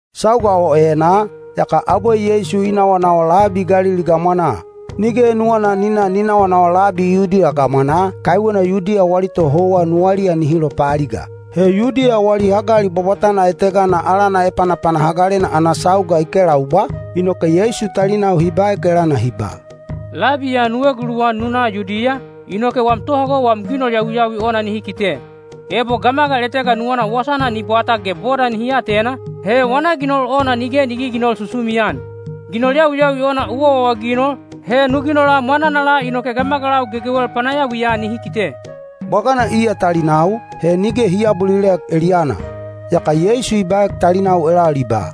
Sauga o enaa, yaka abwe Yeisu i nawanawa labi Galili gamwanaa. Nige nuwana ni na ni nawanawa labi Yudiya gamwanaa, kaiwena Yudiya wali tohouwa nuwaliya nihi lopaaliga. He Yudiya wali hagali bwabwatana etegana alana Epanapana Hagalena ana sauga i kelaubwa, inoke Yeisu talinau hi baek elana hi ba, “Labi ya nu eguluwan nu na Yudiya, inoke wam tohago wam ginol yawiyawi ona nihi kite. Ebo gamagal etega nuwana wasana ni bwata ge boda nihi atena, he wana ginol ona nige ni giginol susumian. Ginol yawiyawi ona u awaawaginol, he nu ginola mwananala inoke gamagalau gegewel panayawiya nihi kite.” Bwagana iya talinau, he nige hi aabulilek eliyana. Yaka Yeisu i baek talinau elal i ba,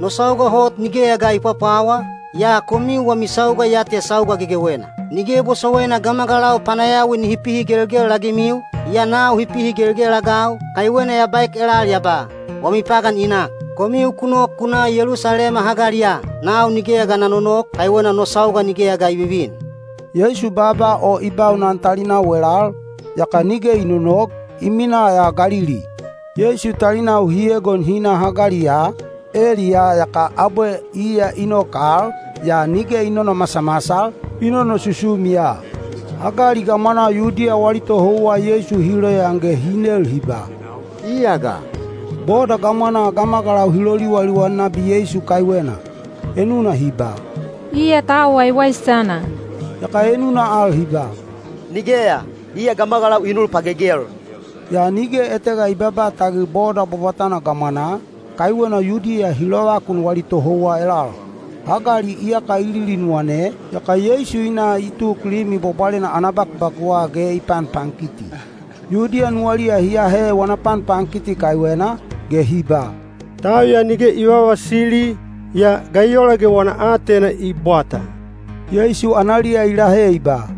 “No sauga hot nigeya ga i pwapwawa, yaa komiu wami sauga ya te sauga gegewena. Nige bosowaina gamagalau panayawi nihi pihigelgel-agimiu, yaa nau hi pihigelgel-agau, kaiwena ya baek elal ya ba, ‘Wami pagan i nak.’ Komiu ku nok ku na Yelusalema hagaliya. Nau nigeya ga na nonok, kaiwena no sauga nigeya ga i vivin.” Yeisu baaba o i baunan talinau elal, yaka nige i nonok, i minaa ya Galili. Yeisu talinau hi egon hi na hagaliya, eliyaa yaka abwe iya i nok al, yaa nige i nonomasamasal, i nonosusumi ya. Hagali gamwanaa Yudiya wali tohouwa Yeisu hi loyaan ge hi nel hi ba, “Iya ga?” Boda gamwanaa gamagalau hi loliwaliwan nabi Yeisu kaiwena. Enuna hi ba, “Iya tau waiwaisana,” yaka enuna al hi ba, “Nigeya, iya gamagalau i nul pagegel.” Yaa nige etega i babaa tagil boda bwabwatana gamwanaa, kaiwena Yudiya hi lovakun wali tohouwa elal. Hagali iyaka i lilinuwane, yaka Yeisu i na i tuk Limi Bwabwalena ana bakubakuwa ge i panpankiti. Yudiya nuwaliya hi ahe wana panpankiti kaiwena, ge hi ba, “Tau ya nige i vavasili, yaa ga i ola ge wana aatena i bwata?” Yeisu analiya i lahe i ba,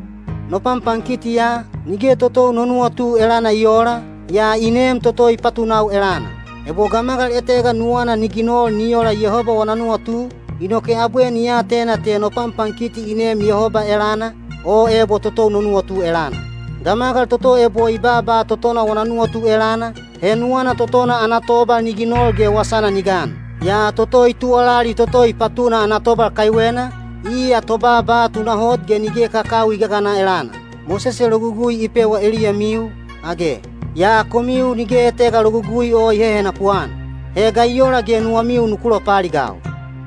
“No panpankiti ya, nige totou no nuwatu elana i oola, yaa i neem toto i patunau elana. Ebo gamagal etega nuwana ni ginol ni ola Yehoba wana nuwatu, inoke abwe ni atena te no panpankiti i neem Yehoba elana, o ebo totou no nuwatu elana. Gamagal toto ebo i baaba totona wana nuwatu elana, he nuwana totona ana tobal ni ginol ge wasana ni gan. Yaa toto i tuwalali toto i patuna ana tobal kaiwena, iya tobaaba tunahot ge nige kakawi i gagana elana. Mosese Logugui i pewa eliyamiu, age? Yaa komiu nige etega Logugui o i hehenapu-an. He ga i ola ge nuwamiu nuku lopaaligau?”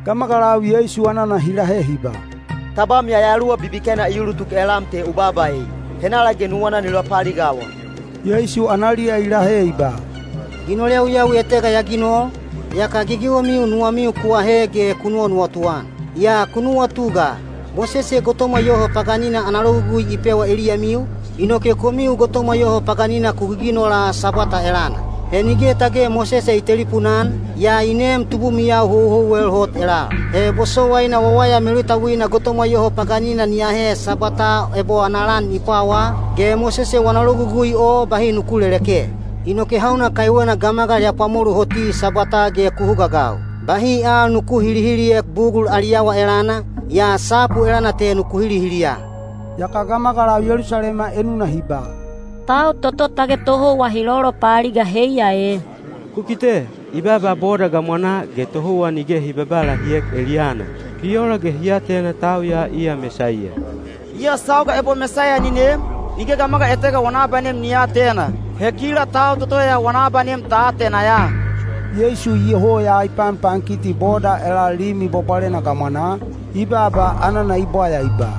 Gamagalau Yeisu anana hi lahe hi ba, “Tabam yayaluwa bibikena i ulutuk elam te u baaba ei! Henala ge nuwana ni lopaaligawa?” Yeisu analiya i lahe i ba, “Ginol yawiyawi etega ya ginol, yaka gegewemiu nuwamiu ku ahe ge ku nuwanuwatu-an. Yaa ku nuwatu ga! Mosese gotomwa yoho paganina ana logugui i pewa eliyamiu, inoke komiu gotomwa yoho paganina ku giginola Sabwata elana. (He nige tage Mosese i telipuna-an, yaa i neem tubumiyau houhouwel hot elal.) He bosowaina wawaya melutauina gotomwa yoho paganina ni ahe Sabwataa ebo ana lan i pwawaa, ge Mosese wana logugui o bahi nuku leleke. Inoke hauna kaiwena gamagal ya pwamolu hoti Sabwataa ge ku hugaagau? Bahi al nuku hilihiliek bugul ali awa elana, yaa sapu elana te nuku hilihiliya.” Yaka gamagalau Yelusalema enuna hi ba, “Tau toto tage tohouwa hi lolopaaliga heiya e? Ku kite! I baaba boda gamwanaa ge tohouwa nige hi babaa lahiek eliyana. Bi ola ge hi atena tau ya iya Mesaiya? Yaa sauga ebo Mesaiya ni nem, nige gamagal etega wana abanem ni aatena. He kila tau toto ya wana abanem ta atena ya.” Yeisu iyoho ya i panpankiti boda elal Limi Bwabwalena gamwanaa, i baaba anana i bwaya i ba,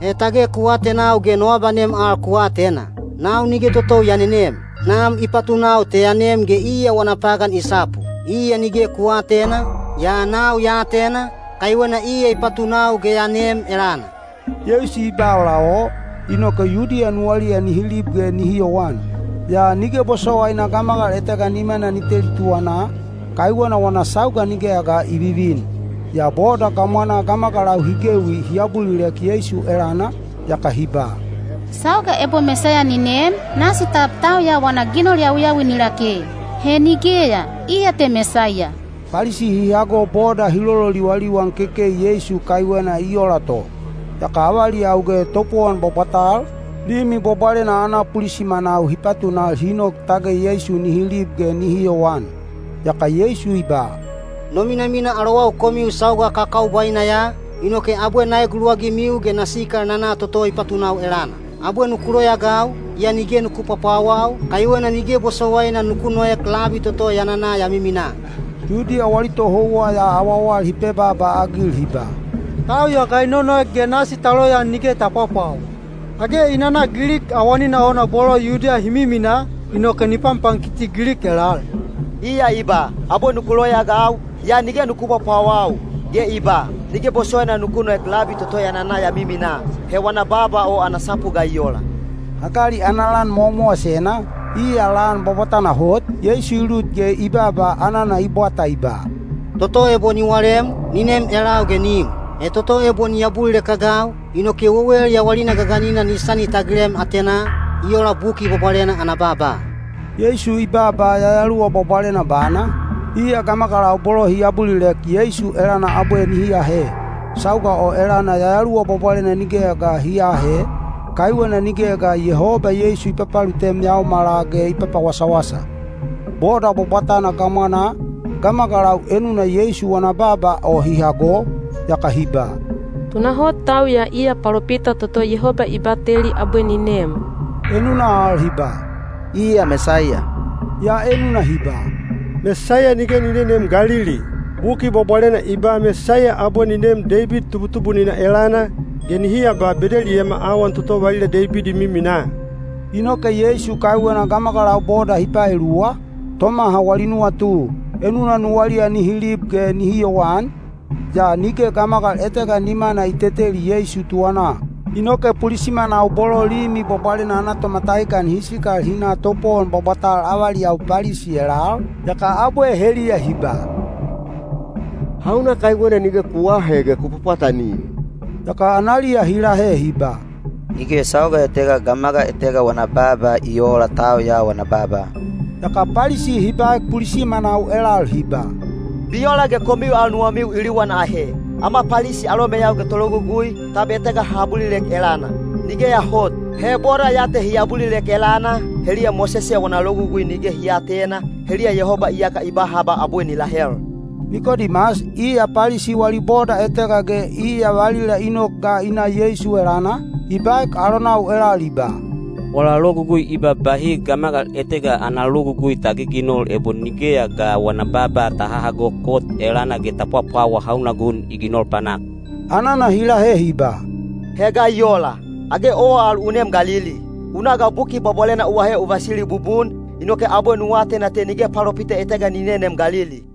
“He tage ku atenau ge no abanem al ku atena? Nau nige totou ya nenem. Nam i patunau te ya nem ge iya wana pagan i sapu. Iya nige ku aatena, yaa nau ya atena, kaiwena iya i patunau ge ya neem elana.” Yeisu i ba ola o, inoke Yudiya nuwaliya nihi lib ge nihi yowan. Yaa nige bosowaina gamagal etega nimana ni teli tuwanaa, kaiwena wana sauga nigeya ga i vivin. Yaa boda gamwanaa gamagalau hi gewi hi abulilek Yeisu elana, yaka hi ba, “Sauga ebo Mesaiya ni nem, nasi tab tau ya wana ginol yawiyawi ni lake? He nigeya, iya te Mesaiya.” Palisi hi hago boda hi lololiwaliwan kekei Yeisu kaiwena i ola to. Yaka avaliyau ge topowon bwabwatal, Limi Bwabwalena ana pulisimanau hi patunal hi nok tage Yeisu nihi lib ge nihi yowan. Yaka Yeisu i ba, “No minamina alowau komiu sauga kakaubwaina ya, inoke abwe na eguluwagimiu ge na sikal na na toto i patunau elana. Abwe nuku loyaagau, yaa nige nuku pwapwawau, kaiwena nige bosowaina nuku noek labi toto ya nana ya miminaa.” Yudiya wali tohouwa ya awawal hi pebaaba-agil hi ba, “Tau ya ga i nonoek ge nasi ta loyaan nige ta pwapwawa? Age i nana Gilik awanina ona bolo Yudiya hi miminaa, inoke ni panpankiti Gilik elal? Iya i ba, ‘Abwe nuku loyaagau, yaa nige nuku pwapwawau.’ Ge i ba, ‘Nige bosowaina nuku noek labi toto ya nana ya miminaa.’ He wana baaba o ana sapu ga i ola?” Hagali ana lan mowamowasena, iya lan bwabwatana hot, Yeisu i lut ge i baaba anana i bwata i ba, “Toto ebo ni walem, ni nem elau ge ni im. He toto ebo ni abulilek-agau, inoke wewel yawalina gaganina ni sani tagilem atenaa, i ola Buki Bwabwalena ana baaba.” Yeisu i baaba Yayaluwa Bwabwalena bana, iya gamagalau bolo hi abulilek Yeisu elana abwe nihi ahe. Sauga o elana Yayaluwa Bwabwalena nigeya ga hi aahe, kaiwena nigeya ga Yehoba Yeisu i papalutem yaomala ge i papawasawasa. Boda bwabwatana gamwanaa, gamagalau enuna Yeisu wana baaba o hi hago, yaka hi ba, “Tunahot tau ya iya palopita toto Yehoba i bateli abwe ni nem.” Enuna al hi ba, “Iya Mesaiya.” Yaa enuna hi ba, “Mesaiya nige ni neneem Galili! Buki Bwabwalena i ba Mesaiya abwe ni neem Deibid tubutubunina elana, ge nihi aba Bedeliyema awan toto valila Deibid i miminaa.” Inoke Yeisu kaiwena gamagalau boda hi paeluwa, tomaha wali nuwatu. Enuna nuwaliya nihi lib ge nihi yowan, yaa nige gamagal etega nimana i teteli Yeisu tuwanaa. Inoke pulisimanau bolo Limi Bwabwalena ana tomatahikan hi sikal hi na topowon bwabwatal avaliyau Palisi elal, yaka abwe heliya hi ba, “Hauna kaiwena nige ku aahe ge ku pwapwatanim?” Yaka analiya hi lahe hi ba, “Nige sauga etega gamagal etega wana baaba i oola tau ya wana baaba!” Yaka Palisi hi baek pulisimanau elal hi ba, “Bi ola ge komiu al nuwamiu i liwan ahe? Ama Palisi alomeyau ge tologugui, tab etega ha abulilek elana? Nigeya hot! He boda ya te hi abulilek elana, heliya Mosese wana Logugui nige hi aatena, heliya Yehoba iyaka i ba haba abwe ni lahel!” Nikodimas, iya Palisi wali boda etega ge iya valila i nok ga i na Yeisu elana, i baek alonau elal i ba, “Wala logugui i ba bahi gamagal etega ana logugui ta giginol ebo nigeya ga wana baaba ta hahago kot elana ge ta pwapwawa hauna gun i ginol panak.” Anana hi lahe hi ba, “He ga i ola, age owa al u neem Galili? U na ga Buki Bwabwalena u ahe u vasili bubun, inoke abwe nu atena te nige palopita etega ni neneem Galili.”